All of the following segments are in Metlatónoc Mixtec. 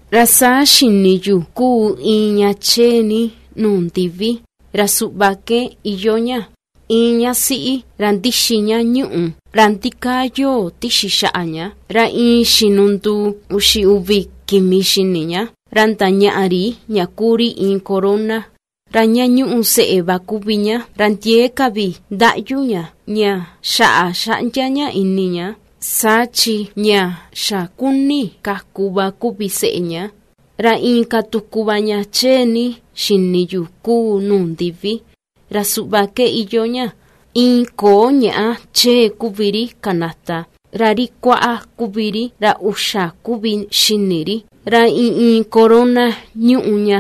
Ra saa xini yu ^kuu iin ña chee ni nuu ndivi, ra suꞌva ke iyoo ña: Iin ña siꞌi ra ndixi ña ñuꞌù, ra ndikaa yoo tixi xaꞌa ña, ra iin xinu nduu uxi uvi kimi xini ña, ra ndañaꞌa ri ña kuu ri iin corona. Ra ña ñúꞌu seꞌe va kuvi ña, ra ndiee ka vi ^ndaꞌyu ña, ña xaꞌa xaꞌndia ña ini ña, saa chi ña xa ^kuni kaku va kuvi seꞌe ña. Ra inka tuku va ña chee ni xini yu ^kuu nuu ndivi, ra suꞌva ke iyoo ña: Iin ko̱o̱ ñàꞌa chee kuvi ri kanata, ra ri kuaꞌa kuvi ri, ra uxa kuvi xini ri, ra iin iin corona ñuꞌu ña,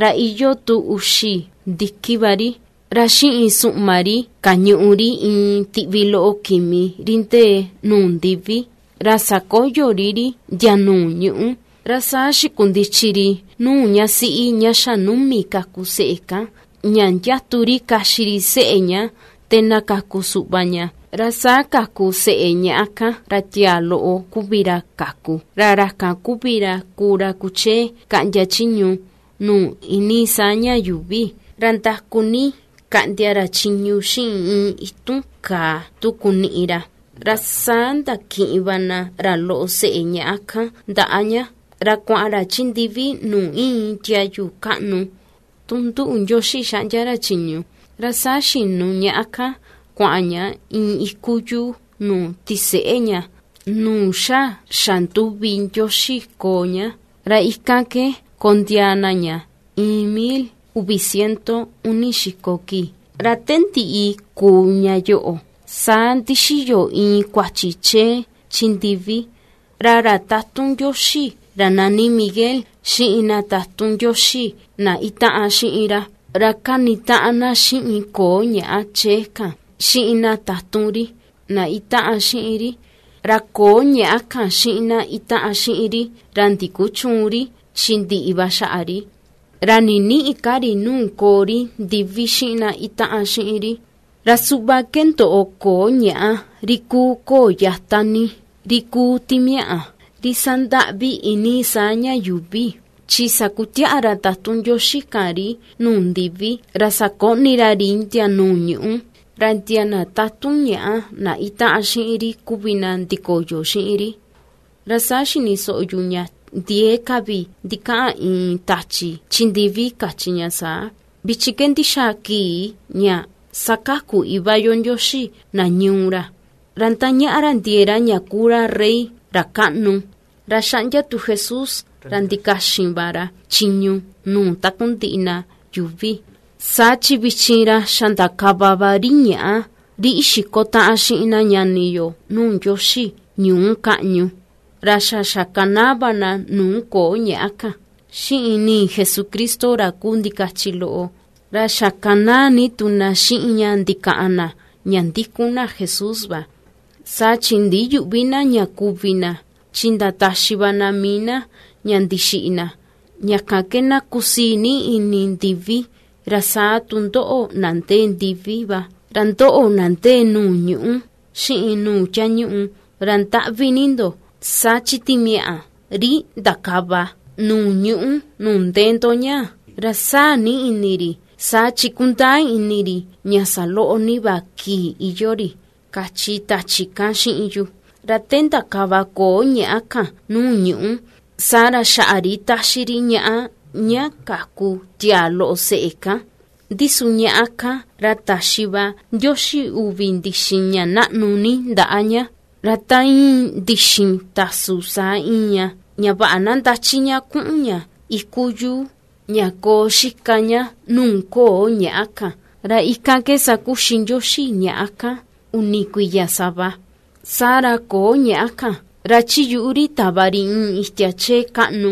ra iyoo tu uxi ndiki va ri. Ra xiꞌin suꞌma ri kañuꞌu ri iin tiꞌvi loꞌo kimi, ri ndee nuu ndivi, ra sakoyo ri ri ndia nuu ñuꞌú. Ra saa xikundichi ri nuu ña siꞌi ña xa ^numi kaku seꞌe kan, ña ^ndiatu ri kaxi ri seꞌe ña te na kaku suꞌva ña. Ra saa kaku seꞌe ñaꞌa kan, ra tiaa loꞌo kuvi ra kaku, ra ra kan kuvi ra kuu ra kuchee kaꞌndia chiñu nuu iinii saa ña yuuvi, ra ndaku ni kaꞌndia ra chiñu xiꞌin iin itun kàà tu kuniꞌi ra. Ra saa ndakiꞌin va na ra loꞌo seꞌe ñaꞌa kan ndaꞌa ña ra kuaꞌan ra chi ndivi nuu íin tiayu kaꞌnu tu nduꞌu Ndioxi xaꞌndia ra chiñu. Ra saa xinu ñaꞌa kan kuaꞌan ña iin iku yuu nuu tiseꞌe ña, nuu xa xanduvi Ndioxi koo ña, ra ikan ke kondiaa na ña iin mil uvi ciento uni xiko kii. Ra te ndiꞌi kuu ña yoꞌo, saa ndixiyo iin kuachi chee chi ndivi: Ra ra tatun Ndioxi ra nani Miguel xiꞌin na tatun Ndioxi na ^itaꞌan xiꞌin ra, ra ^kanitaꞌan na xiꞌin koo ñàꞌa chee kan, xiꞌin na tatun ri, na ^itaꞌan xiꞌin ri. Ra ko̱o̱ ñàꞌa kan xiꞌin na ^itaꞌan xiꞌin ri, ra ndikuchüun ri chi ndiꞌi va xaꞌa ri, ra ninïꞌi ka ri nuu koo ri ndivi xiꞌin na ^itaꞌan xiꞌin ri. Ra suꞌva ke ndoꞌo ko̱o̱ ñàꞌa, ri kuu ko̱o̱ yata ni, ri kuu timiaꞌa, ri ^sandaꞌvi iinii saa ña yuuvi, chi sakutiaꞌa ra tatun Ndioxi kan ri nuu ndivi ra sakoꞌni ra ri ndia nuu ñuꞌú, ra ndia na tatun ñàꞌa na itaꞌan xiꞌin ri kuvi na ndikoyo xiꞌin ri. Ra saa xini soꞌo yu ña ndiee ka vi ndikaꞌan iin tachi chi ndivi kachi ña saa: ―Vichin ke ndixaa kii ña ^sakaku Iva yo Ndioxi na ñuu ra, ra ^ndañaꞌa ra ndiee ra ña kuu ra Rey ra kaꞌnu, ra ^xaꞌndia tu Jesús, ra ndikaxin va ra chiñu nuu takundiꞌi na yuuvi. Saa chi vichin ra xa ndakava va ri ñaꞌa ri ixiko taꞌan xiꞌin na ñani yo nuu Ndioxi ñuu kaꞌñu. Ndi su na ñani yo, ra xa xakanaa va na nuu ko̱o̱ ñàꞌa kan, xiꞌin ni̱i̱ Jesucristo ra kuu ndikachi loꞌo, ra xakanaa ni tu na xiꞌin ña ndikaꞌan na ña ^ndikun na Jesús va; saa chi ndiyüꞌvi na ña kuvi na, chin ndataxi va na mii na ña ndixiꞌi na. ¡Ña kan ke na kusii ni ini ndivi, ra saa tu ndoꞌo na ndee ndivi va! ¡Ra ndoꞌo, na ndee nuu ñuꞌú, xiꞌin nuu tiañuꞌu, ra ndaꞌvi ni ndo! Saa chi timiaꞌa ri ^ndakava nuu ñuꞌú nuu ndee ndo ñáa̱, ra sáa̱ ni ini ri, saa chi ^kundaa ini ri ña saloꞌo ni va kii iyoo ri ―kachi tachi kan xiꞌin yu. Ra te ndakava ko̱o̱ ñàꞌa kan nuu ñuꞌu, saa ra xaꞌa ri ^táxí ri ñaꞌá, ña kaku tiaa loꞌo seꞌe kan. Ndi su ñaꞌá kan, ra ta̱xi va Ndioxi uvi ndixin ña naꞌnu ni ndaꞌa ña, ra ta íin ndixin tasu saa íin ña, ña vaꞌa na ndachi ña kuꞌun ña iku yuu, ña koo xika ña nuu koo ñàꞌa kan, ra ikan ke sakuxi Ndioxi ñaꞌá kan, uni kuiya sava. Saa ra ko̱o̱ ñàꞌa kan, ra chi yuꞌu ri tava ri iin itia chee kaꞌnú,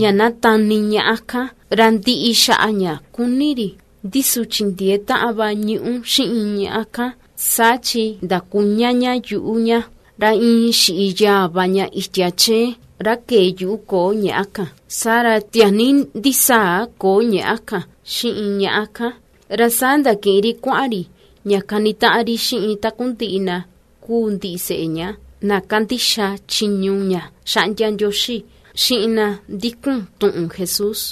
ña na tani ñaꞌa kan, ra ndiꞌi xaꞌa ña kuni ri. Ndi su chindiee taꞌan va ñuꞌú xiꞌin ñàꞌa kan, saa chi ndakuña ña yuꞌu ña, ra iin xiꞌi yaa va ña itia chee, ra kee yuꞌu ko̱o̱ ñàꞌa kan. Saa ra tiaa ni ndisaa ko̱o̱ ñàꞌa kan, xiꞌin ñaꞌa kan, ra saa ndakiꞌin ri kuaꞌan ri ña kanitaꞌan ri xiꞌin takundiꞌi na kúú ndiseꞌe ña, na ^kandixa chiñu ña xaꞌndia Ndioxi, xiꞌin na ^ndikun tuꞌun Jesús.